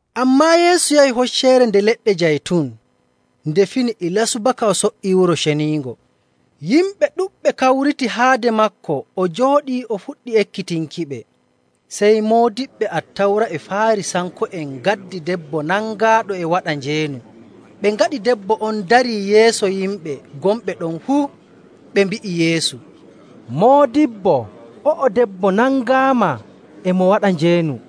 Ammaa Yeesu yahi Hocceere Nde Leɗɗe Jaytun. Nde fini ilaa subaka o so''ii Wuro Ceniingo. Yimɓe ɗuɗɓe kawriti haade maako, o jooɗii o fuɗɗii ekkitinkiɓe. Sey Moodiɓɓe Attawra e Faarisanko'en ngaddi debbo nangaaɗo e waɗa njeenu. Ɓe ngaɗi debbo on darii yeeso yimɓe gonɓe ɗon fuu. Ɓe mbi'i Yeesu, “Moodibbo, o'o debbo nangaama e mo waɗa njeenu.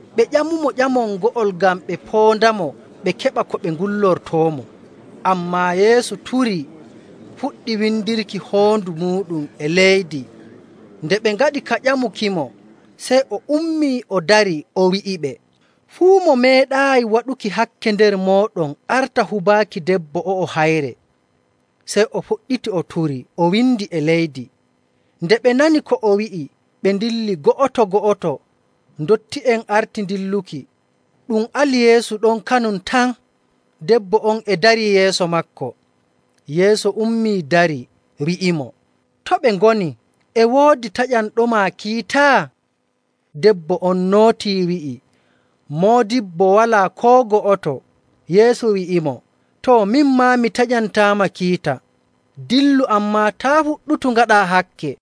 Ɓe ƴamumo ƴamol ngo'ol ngam ɓe poondamo ɓe keɓa ko ɓe ngullortoomo. Ammaa Yeesu turii fuɗɗi windirki hoondu muuɗum e leydi. Nde ɓe ngaɗi ka ƴamukimo, sey o ummii, o darii, o wi'iɓe, “Fuu mo meeɗaayi waɗuki hakke nder mooɗon arta hubaaki debbo o'o hayre.” Sey o fuɗɗiti o turii, o windi e leydi. Nde ɓe nani ko o wi'i, ɓe ndilli go'oto‑go'oto, ndotti'en arti dilluki. Ɗum ali Yeesu ɗon kanum tan, debbo on e darii yeeso maako. Yeesu ummii, darii, wi'imo, “To ɓe ngoni? E woodi taƴanɗoma kiita?” Debbo on nootii wi'i, “Moodibbo, walaa koo go'oto.” Yeesu wi'imo, “Too, min maa mi taƴantaama kiita. Dillu, ammaa taa' fuɗɗutu ngaɗaa hakke.”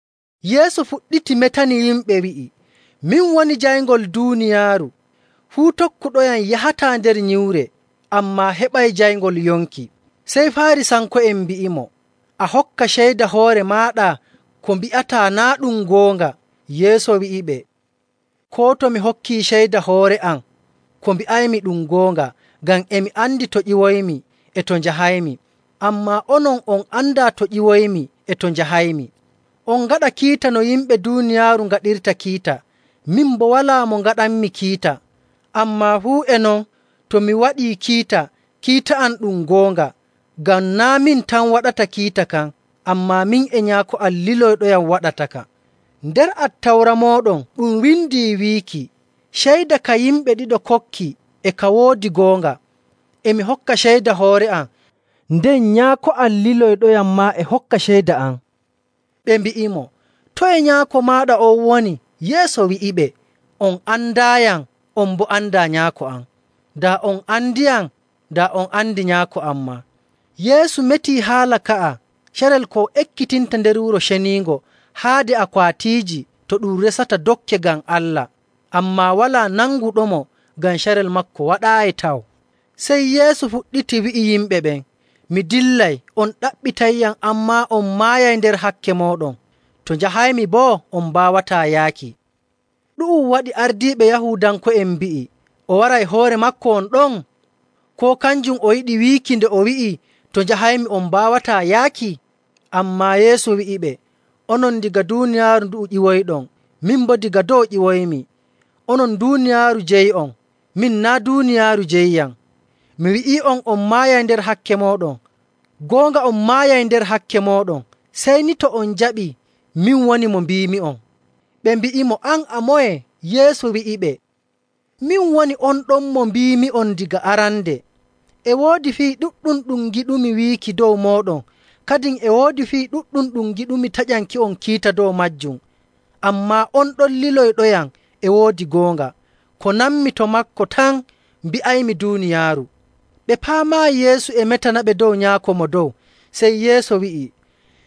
Yeesu fuɗɗiti metani yimɓe wi'i, “Min woni jayngol duuniyaaru. Fuu tokkuɗoyam yahataa nder nyiwre, ammaa heɓay jayngol yonki.”. Sey Faarisanko'en mbi'imo, “A hokka ceyda hoore maaɗa, ko mbi'ataa naa' ɗum goonga.”. Yeesu wi'iɓe, “Koo to mi hokkii ceyda hoore am, ko mbi'aymi ɗum goonga, ngam e mi andi to ƴiwoymi e to njahaymi. Ammaa onon on andaa to ƴiwoymi e to njahaymi. On ngaɗa kiita no yimɓe duuniyaaru ngaɗirta kiita, min boo walaa mo ngaɗanmi kiita. Ammaa fuu e non to mi waɗii kiita, kiita am ɗum goonga, ngam naa' min tan waɗata kiita kan, ammaa min e Nyaako am liloyɗoyam waɗataka. Nder Attawra mooɗon ɗum windi wiikii ceyda ka yimɓe ɗiɗo kokki e ka woodi goonga.. E mi hokka ceyda hoore am, nden Nyaako am liloyɗoyam maa e hokka ceyda am.” Ɓe mbi'imo, “Toye nyaako maaɗa on woni?” Yeesu wi'iɓe, “On andaayam, on boo andaa Nyaako am. Daa on andiyam, daa on andi Nyaako am maa.” Yeesu metii haala ka'a carel ko o ekkitinta nder Wuro Ceniingo haade akwaatiiji to ɗum resata dokke ngam Allah. Ammaa walaa nanguɗomo ngam carel maako waɗaayi taw. Sey Yeesu fuɗɗiti wi'i yimɓe ɓen, “Mi dillay, on ɗaɓɓitayyam, ammaa on maayay nder hakke mooɗon. To njahaymi boo, on mbaawataa yaaki.” Ɗu'um waɗi ardiiɓe Yahuudanko'en mbi'i, “O waray hoore maako won ɗon? Koo kanjum o yiɗi wiiki nde o wi'i, ‘To njahaymi on mbaawataa yaaki?’” Ammaa Yeesu wi'iɓe, “Onon daga duuniyaaru ndu'u ƴiwoyɗon, min boo daga dow ƴiwoymi. Onon duuniyaaru jeyi'on, min naa' duuniyaaru jeyiyam. Mi wi'ii'on on maayay nder hakke mooɗon, goonga on maayay nder hakke mooɗon sey ni to on njaɓii min woni mo mbiimi'on.” Ɓe mbi'imo, “An a moye?” Yeesu wi'iɓe, “Min woni on ɗon mo mbiimi'on daga arande. E woodi fii ɗuɗɗum ɗum ngiɗumi wiiki dow mooɗon, kadin e woodi fii ɗuɗɗum ɗum ngiɗumi taƴanki'on kiita dow maajum. Ammaa on ɗon liloyɗoyam e woodi goonga. Ko nanmi to maako tan mbi'aymi duuniyaaru.” Ɓe paamaayi Yeesu e metanaɓe dow Nyaako Mo Dow. Sey Yeesu wi'i,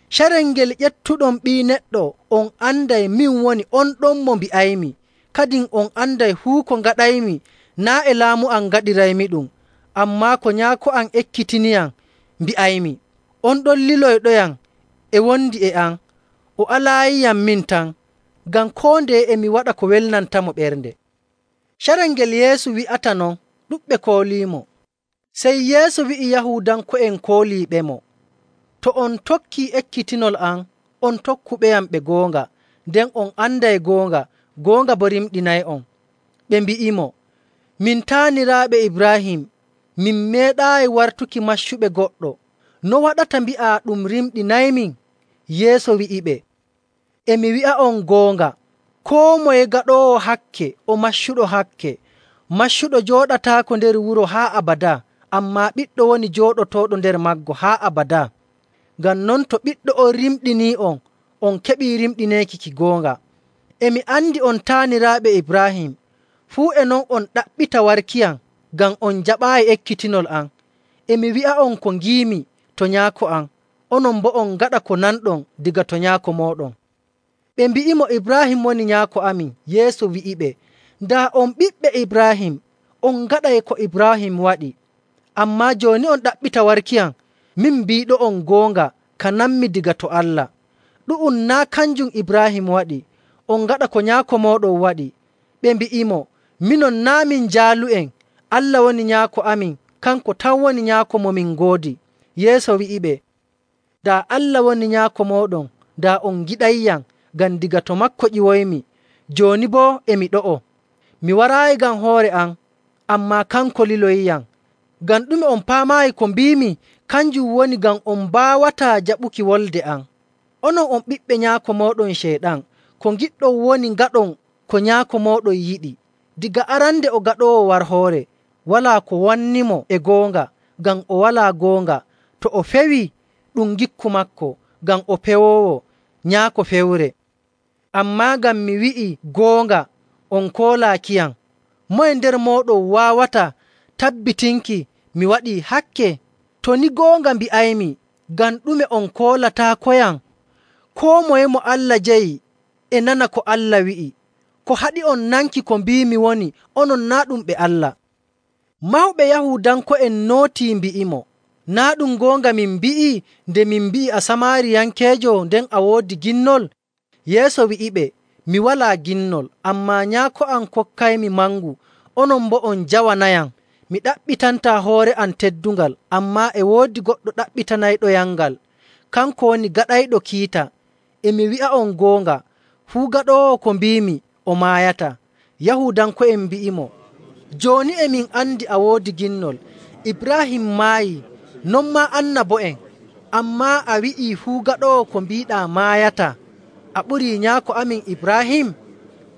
“Carel ngel ƴeftuɗon Ɓii Neɗɗo, on anday min woni on ɗon mo mbi'aymi. Kadin on anday fuu ko ngaɗaymi naa' e laamu am ngaɗiraymiɗum, ammaa ko Nyaako am ekkitiniyam mbi'aymi. On ɗon liloyɗoyam e wondi e am, o alaayiyam min tan, ngam koo ndeye e mi waɗa ko welnantamo ɓernde.” Carel ngel Yeesu wi'ata non, ɗuɗɓe kooliimo. Sey Yeesu wi'i Yahuudanko'en kooliiɓemo, “To on tokkii ekkitinol am, on tokkuɓeyam ɓe goonga. Nden on anday goonga, goonga boo rimɗinay'on.” Ɓe mbi'imo, “Min taaniraaɓe Ibraahim, min meeɗaayi wartuki maccuɓe goɗɗo. No waɗata mbi'aa, ‘Ɗum rimɗinaymin?’”. Yeesu wi'iɓe, “E mi wi'a'on goonga, koo moye gaɗoowo hakke o maccuɗo hakke. Maccuɗo jooɗataako nder wuro haa abadaa, ammaa ɓiɗɗo woni jooɗotooɗo nder maago haa abadaa. Ngam non to Ɓiɗɗo on rimɗinii'on, on keɓii rimɗineeki ki goonga. E mi andi on taaniraaɓe Ibraahim, fuu e non on ɗaɓɓita warkiyam, ngam on njaɓaayi ekkitinol am. E mi wi'a'on ko ngiimi to Nyaako am, onon boo on ngaɗa ko nanɗon daga to nyaako mooɗon.” Ɓe mbi'imo, “Ibraahim woni nyaako amin.” Yeesu wi'iɓe, “Daa on ɓiɓɓe Ibraahim, on ngaɗay ko Ibraahim waɗi. Ammaa jooni on ɗaɓɓita warkiyam, min biiɗo'on goonga ka nanmi daga to Allah. Ɗu'um naa' kanjum Ibraahim waɗi. On ngaɗa ko nyaako mooɗon waɗi.” Ɓe mbi'imo, “Minon naa' min jaalu'en, Allah woni Nyaako amin, kanko tan woni Nyaako mo min ngoodi.” Yeesu wi'iɓe, “Daa Allah woni Nyaako mooɗon, daa on ngiɗayyam, ngam daga to maako ƴiwoymi, jooni boo e mi ɗo'o. Mi waraayi ngam hoore am, ammaa kanko liloyiyam. Ngam ɗume on paamaayi ko mbiimi? Kanjum woni ngam on mbaawataa jaɓuki wolde am. Onon on ɓiɓɓe nyaako mooɗon Ceyɗan, ko ngiɗɗon woni ngaɗon ko nyaako mooɗon yiɗi. Daga arande o gaɗoowo warhoore. Walaa ko wannimo e goonga, ngam o walaa goonga. To o fewii, ɗum ngikku maako, ngam o pewoowo, nyaako fewre. Ammaa ngam mi wi'i goonga, on koolaakiyam. Moye nder mooɗon waawata tabbitinki mi waɗii hakke? To ni goonga mbi'aymi, ngam ɗume on koolataakoyam? Koo moye mo Allah jeyi e nana ko Allah wi'i. Ko haɗi'on nanki ko mbiimi woni onon naa' ɗum ɓe Allah.” Mawɓe Yahuudanko'en nootii mbi'imo, “Naa' ɗum goonga min mbi'i nde min mbi'i a Samaariyankeejo nden a woodi ginnol?” Yeesu wi'iɓe, “Mi walaa ginnol, ammaa Nyaako am kokkaymi mangu, onon boo on njawanayam. Mi ɗaɓɓitantaa hoore am teddungal, ammaa e woodi goɗɗo ɗaɓɓitanayɗoyamngal, kanko woni gaɗayɗo kiita. E mi wi'a'on goonga, fuu gaɗoowo ko mbiimi, o maayataa.” Yahuudanko'en mbi'imo, “Jooni e min andi a woodi ginnol. Ibraahim maayii, non maa annabo'en, ammaa a wi'ii fuu gaɗoowo ko mbiiɗaa maayataa. A ɓurii nyaako amin Ibraahim?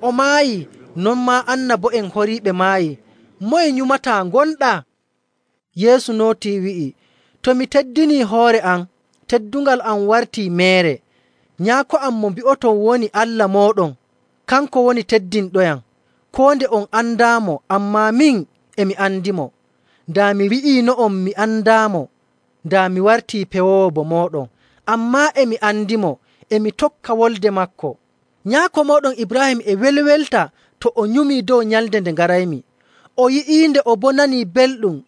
O maayii, non maa annabo'en horiiɓe maayii. Moye nyumataa gonɗaa?” Yeesu nootii wi'i, “To mi teddinii hoore am, teddungal am wartii meere. Nyaako am mo mbi'oton woni Allah mooɗon, kanko woni teddinɗoyam. Koo nde on andaamo, ammaa min e mi andimo. Daa mi wi'iino'on mi andaamo, daa mi wartii pewoowo bo mooɗon. Ammaa e mi andimo, e mi tokka wolde maako. Nyaako mooɗon Ibraahim e welwelta to o nyumii dow nyalnde nde ngaraymi. O yi'iinde, o boo nanii belɗum.”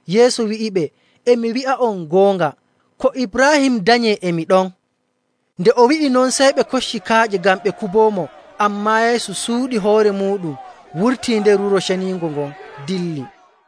Yeesu wi'iɓe, “E mi wi'a'on goonga, ko Ibraahim danyee e mi ɗon.” Nde o wi'i non, sey ɓe kocci kaaƴe ngam ɓe kuboomo, ammaa Yeesu suuɗi hoore muuɗum, wurtii nder Wuro Ceniingo ngon dilli.